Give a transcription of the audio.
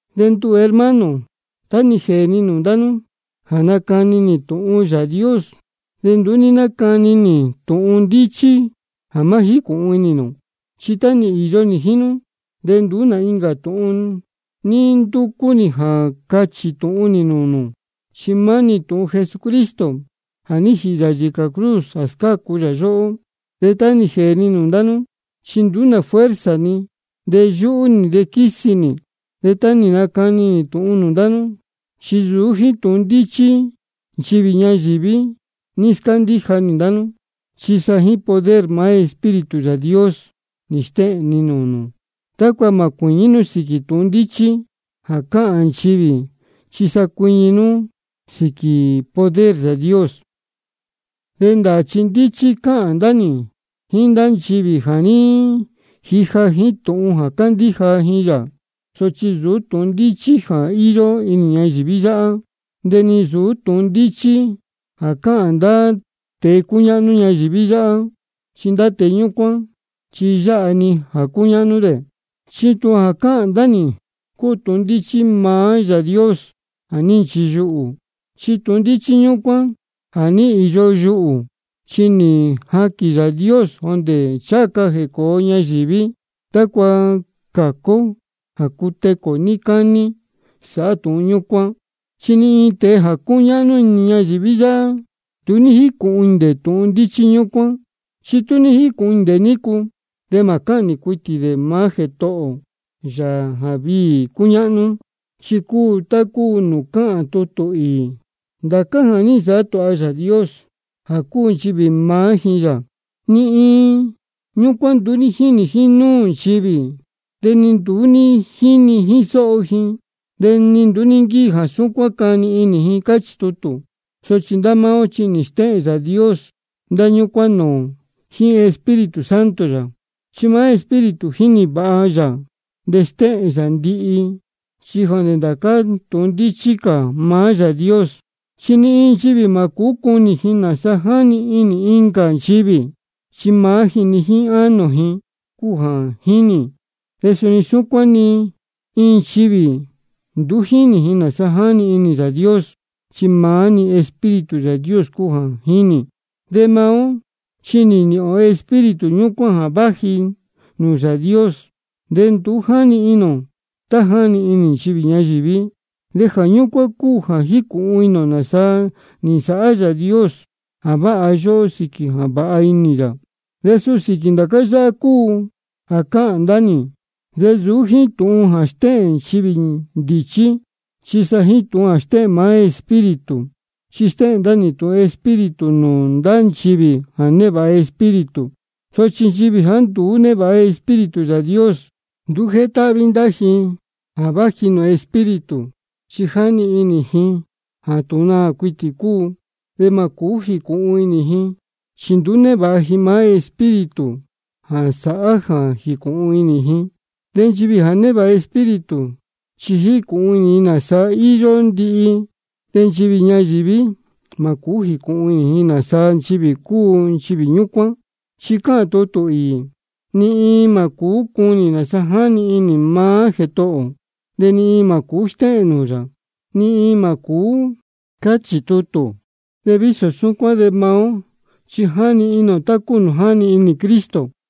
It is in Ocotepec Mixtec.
De nduhū, hermano, tá nī jēē ni nūū ndá nú jā nacani nī tūhun ndāā Yāā Dios, de nduú ní nácani nī tūhun ndíchí jā má jícūhun inī nū. Chi tá nī īyo nī jíín nú de nduú nā incā tūhun ní ndúcú nī jā cachī tūhun nī nūū nū, chi maá-ni tūhun Jesucristo jā ní jīhī yā yīcā cruz jā scácu yā yóhó. De tá nī jēē ni nūū ndá nú, chi nduú nā fuerza ni, de yúhú nī, de quísi nī. De tá nī nacani nī tūhun nūū ndá nú, chi nsūú jíín tūhun ndíchí nchivī ñayīví ní scándíja nī ndá nú, chi sa jíín poder maá Espíritu Yāā Dios nī stéhēn ni nūū nū, tácua mā cuīñí nú sīquī tūhun ndíchí jā cáhān nchivī, chi sa cuiñi nú sīquī poder Yāā Dios. De ndāā chi ndíchí cáhān ndá nī jíín ndá nchivī ja nī jija jíín tūhun jā cándíja ji yā. Sochi nsūú tūhun ndíchí jā íyó inī ñayīví yáhá, de ni nsūú tūhun ndíchí jā cáhān ndá tēe cúñáhnú ñayīví yáhá, chi ndá tēe ñúcuán chi yáha-ni jā cúñáhnú dē. Chi tūhun jā cáhān ndá nī cúu tūhun ndíchí maá Yāā Dios jā ní nchiyuhū. Chi tūhun ndíchí ñúcuán jā ní īyo yuhū, chi nī jaquīn Yāā Dios jondē ncháha ca jēcōo ñayīví, tácua cācu ó jā cutecū ō níí cání sāhá tūhun ñúcuán. Chi ni iin tēe jā cúñáhnú inī ñayīví yáhá, nduú ní jícūhun inī dē tūhun ndíchí ñúcuán. Chi tú ní jícūhun inī dē nícu, de mā cáhnī cuitī dē maá Jētohō ō, Yāā jā viī cúñáhnú. Chi cúu tá cúu nūū cáhān tutū īī: Ndācá jā ní nsāhá tūha Yāā Dios jā cuu nchivī jā mānī jíín yā, ni iin ñúcuán nduú ní jínī jínúū nchivī, de ni nduú ní jíni jíín sóho ji, de ni nduú ní nquíji jā súcuán cani inī ji. Cáchī tutū. Sochi ndá máá ó chi nī stéhēn Yāā Dios ndá ñúcuán nūū ō jíín Espíritu Santo yā. Chi maá Espíritu jínī vāha yā de stéhēn yā ndihi, chi jondē ndācá tūhun ndíchí cā maá Yāā Dios. Chi ni iin nchivī mā cūú cunī ji nāsa jáni inī incā nchivī, chi maá ji-ni jíín ánō ji cúu jā jínī. De suni súcuán ni iin nchivī nduú jínī ji nāsa jáni inī Yāā Dios, chi maá-ni Espíritu Yāā Dios cúu jā jínī. De maá ó chi nī nīhīn ō Espíritu ñúcuán jā váji nūū Yāā Dios, de nduú jáni inī ō tá jáni inī nchivī ñayīví. De jā ñúcuán cúu jā jícūhun inī ō nāsa nī nsāhá Yāā Dios jā váha yóhó sīquī jā vāha inī yā. De suu sīquī ndācá yáhá cúu jā cáhān ndá nī, de nsūú jíín tūhun jā stéhēn nchivī ndīchí, chi sa jíín tūhun jā stéhēn maá Espíritu. Chi stéhēn ndá nī tūhun Espíritu nūū ndá nchivī jā névāha Espíritu. Sochi nchivī jāá nduú névāha Espíritu Yāā Dios, nduú jétáhví ji ndá tūhun jā váji nūū Espíritu, chi jáni inī ji jā tūhun naā cuitī cúu. De mā cūú jīcūhun inī ji, chi nduú névāha ji maá Espíritu jā sāhá jā jīcūhun inī ji. De nchivī jā névāha Espíritu, chi jícūhun inī ji nāsa íyó ndihi-ni. De nchivī ñayīví mā cūú jīcūhun inī ji nāsa nchivī cúu nchivī ñúcuán. Chi cáhān tutū īī: ¿Ní iin cuu cunī nāsa jáni inī maá Jētohō ō? ¿De ní iin cuu stéhēn nūū yā? Ni iin mā cūú. Cáchī tutū. De vísō súcuán de maá ó chi jáni inī ō tá cúu nūū jáni inī Cristo.